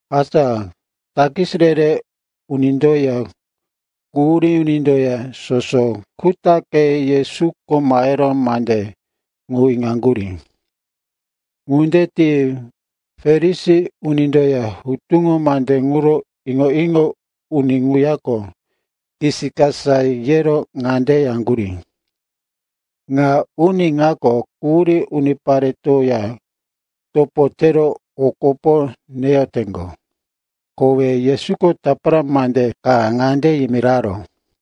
Asa takis re-re unindoya quhurí unindoya soso kutaqe Yesuko mahero mandí ŋu iŋoyaŋgurí. Ŋunde ti Farisi unindoya hutuŋo mande ŋuro iŋo-iŋo uni ŋuyako kisikasa yero ŋande yaŋgurí, “Ŋa uni ŋako quhurí uniparetoya topo tero o kopo neyoteŋgo.” Kowe Yesuko tapara mande ka ŋande yimiraró,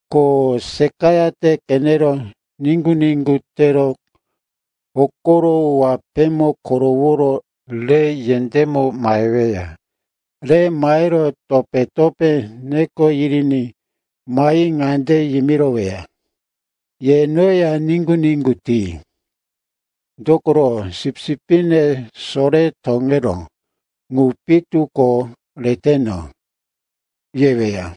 Ko seqayate qenero niŋgu-niŋgu tero hokoro wapémo koroworo re yendémo maheweya. Re mahero topé-topé neko yiriní mahi ŋande yimiroweya, ‘Ye noya niŋgu-niŋgu ti. Dokoro sipsipne sore toŋeró ŋu pitu ko reteno,’ yeweya.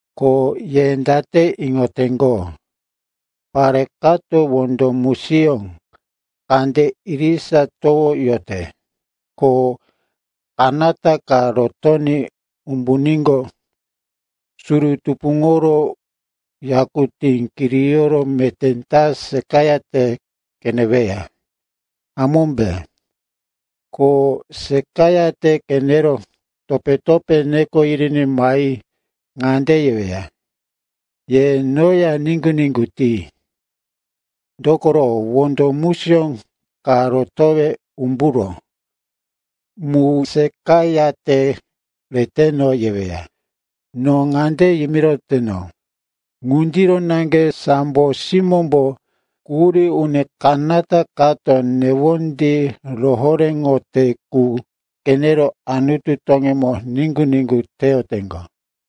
“Ko ye date iŋoteŋgo, pare kato wondo musiyó kande irisa towoyote, ko kanata ka rotoní umbuníqo, suru tupuŋoro yakutí kiriyoro meté ta seqayate qeneweya, hamómbe? Ko seqayate qenero topé-topé neko yiriní mahi ŋande yeweya, ‘Ye noya niŋgu-niŋgu ti. Dokoro wondo musiyó ka rotowe umburó mu seqayate reteno,’ yeweya. “No ŋande yimiroteno, ŋundiro naŋge sambo simómbo quhurí uni kanata kato newondí rohoréŋote qu qenero Anutu toŋímo niŋgu-niŋgu teyoteŋgo.”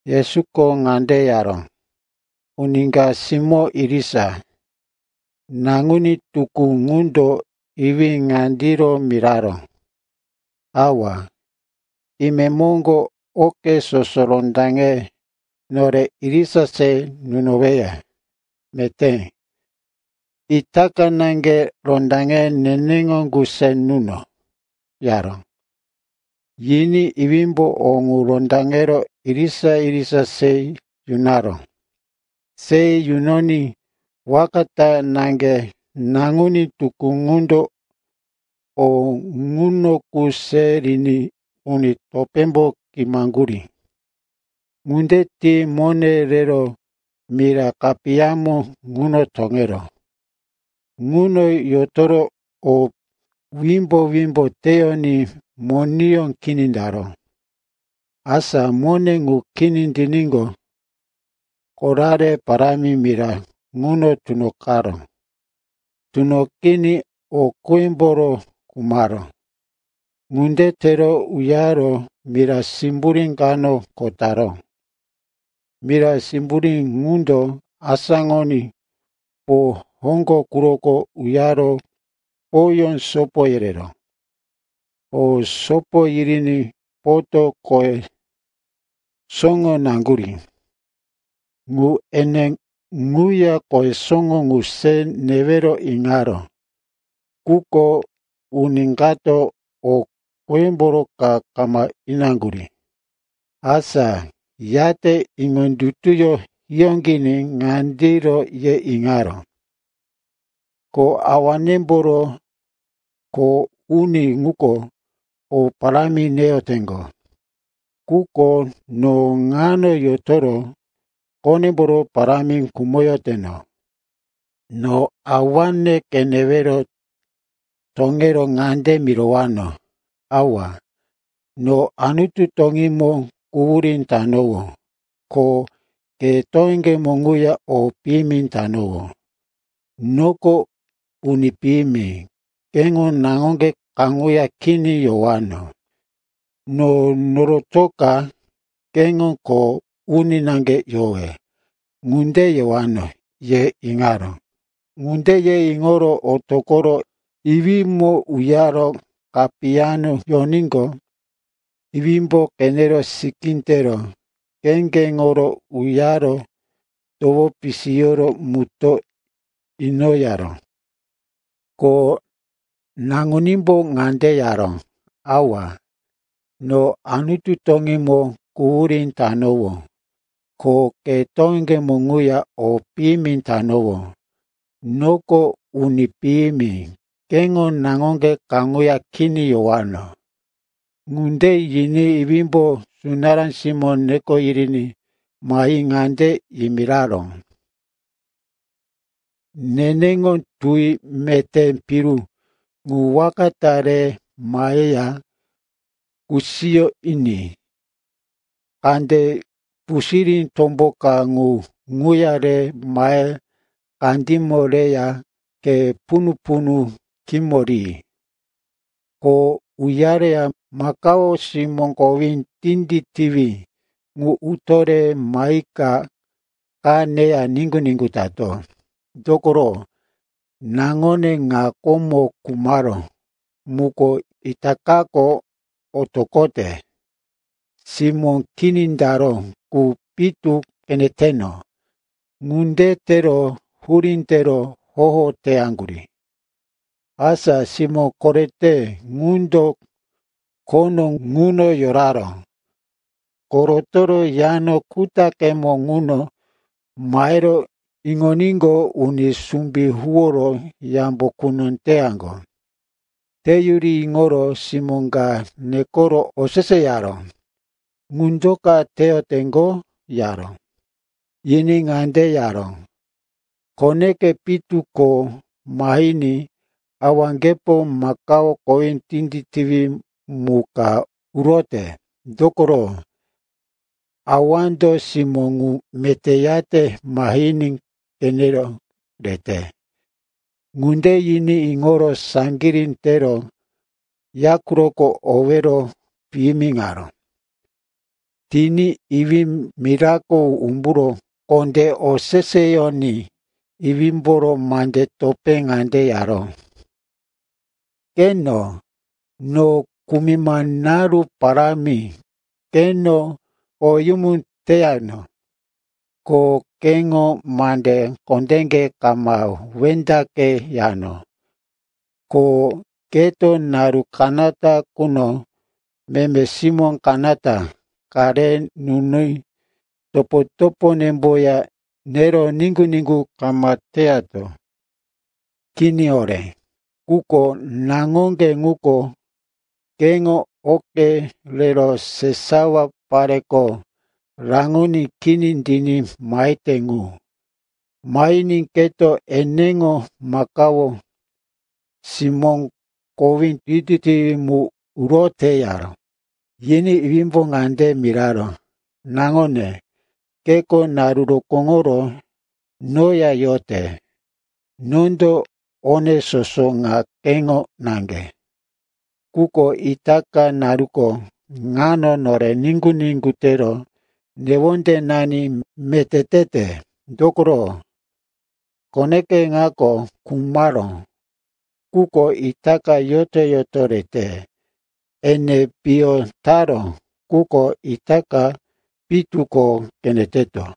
Yesuko ŋande yaró, “Uni ka simó irisa. Naŋuní tukú ŋundo iwí ŋandiro miraró, ‘Awa, imemoŋgo oke soso rondaŋe nore irisa se nunoweya. Meté, itaka naŋge rondaŋe neneŋo qu se nuno,’ yaró. Yiní iwímbo o ŋu rondaŋero irisa-irisa se yunaró. Se yunoní waka ta naŋge naŋuní tukú ŋundo o ŋuno qu se riní uni topémbo kimo taŋgurí. Ŋunde ti mone rero mira kapiyamo ŋuno toŋeró. Ŋuno yotoro o wimbo-wimbo teyoní moneyó kini taró. “Asa mone ŋu kini tiníqo, korare parámi mira ŋuno tunoqaró. Tunoqiní o qímboro khumaró. Ŋunde tero uyaro mira simburí kano kho taró. Mira simburí ŋundo asáŋoní po hoŋgo quroko uyaro poyó sopo yereró. Po sopo yiriní poto qohe soŋo naŋgurí. Ŋu ene ŋuya qohe soŋo ŋu se newero iŋaró. Quko uni kato o qímboro ka kama inaŋgurí. “Asa yate iŋondutuyó hiyóqiní ŋandiro ye iŋaró, ‘Ko awanemboro kho uni ŋuko o parámi neyoteŋgo. Quko no ŋano yotoro qonemboro parámi khumoyoteno. No awane qenewero toŋero ŋande mirowano, “Awa, no Anutu toŋímo quhurí tanowó, ko ke toŋeŋgemo ŋuya o piyimi tanowó. Noko uni piyimi, keŋo naŋoŋge kaŋuya kini yowano. No norotoka keŋo kho uni naŋge yowe,” ŋunde yewano,’ ye iŋaró. “Ŋunde ye iŋoro otoqoro iwímo uyaro kapiyamo yoníqo, iwímbo qenero sikí tero, kheŋgeŋoro uyaro towo pisiyoro mutó inoyaró. “Ko naŋunímbo ŋande yaró, ‘Awa, no Anutu toŋímo quhurí tanowó, ko ke toŋeŋgemo ŋuya o piyimi tanowó. Noko uni piyimi, keŋo naŋoŋge kaŋuya kini yowano.’ “Ŋunde yiní iwímbo sunará simó neko yiriní mahi ŋande yimiraró, ‘Neneŋo tuwi meté piru ŋu waka ta re maheya kusiyo ini. Kande pusirí tombo ka ŋu ŋuya re mahe kandímo reya khe punu-punu khímo ri. Ko uyareya makao simó kowí tinditiwí ŋu uto re mahika qa neya niŋgu-niŋgu tato. Dokoro naŋone ŋa komo khumaró muko itakako otoqote; simó kini taró qu pitu qeneteno.’ Ŋunde tero hurí tero hoho teyaŋgurí. “Asa simó korete ŋundo khono ŋuno yoraró. Kho rotoro yano kutaqemo ŋuno mahero iŋoníqo, uni sumbí huworo yambo quno teyaŋgo. Teyuri iŋoro simó ka nekoro oseseyaró, ‘Ŋu do ka teyoteŋgo?’ yaró. Yiní ŋande yaró, ‘Koneke pitu ko mahiní, awaŋgepo makao kowí tinditiwí mu ka urote. Dokoro, awando simó ŋu meté yate mahiní qenero rete.’ “Ŋunde yiní iŋoro saŋgirí tero ya quroko owero piyimiŋaró. Tiní iwí mirako umburo kondé oseseyoní iwímboro mandí topé ŋande yaró, ‘Qeno, no kumima naru parámi keŋo koweyumu teyano. Ko keŋo mande kondéke kama wendaqeyano. Ko keto naru kanata quno meme simó kanata ka re nuni topo-toponemboya nero niŋgu-niŋgu kama teyato. Kini horé. Quko naŋoŋge ŋuko keŋo oke rero sesawa pareko raŋoní kini tiní mahete ŋu. Mahiní keto eneŋo makao simó kowí tinditiwí mu urote,’ yaró. “Yiní iwímbo ŋande miraró, ‘Naŋone, keko naru rokóŋoro noya yote. Nondo one soso ŋa keŋo naŋge. Quko itaka naruko ŋano nore niŋgu-niŋgu tero newondenani meté tete, dokoro, koneke ŋako khumaró, quko itaka yoto-yoto rete. Ene piyo taró, quko itaka pitu ko qeneteto.’”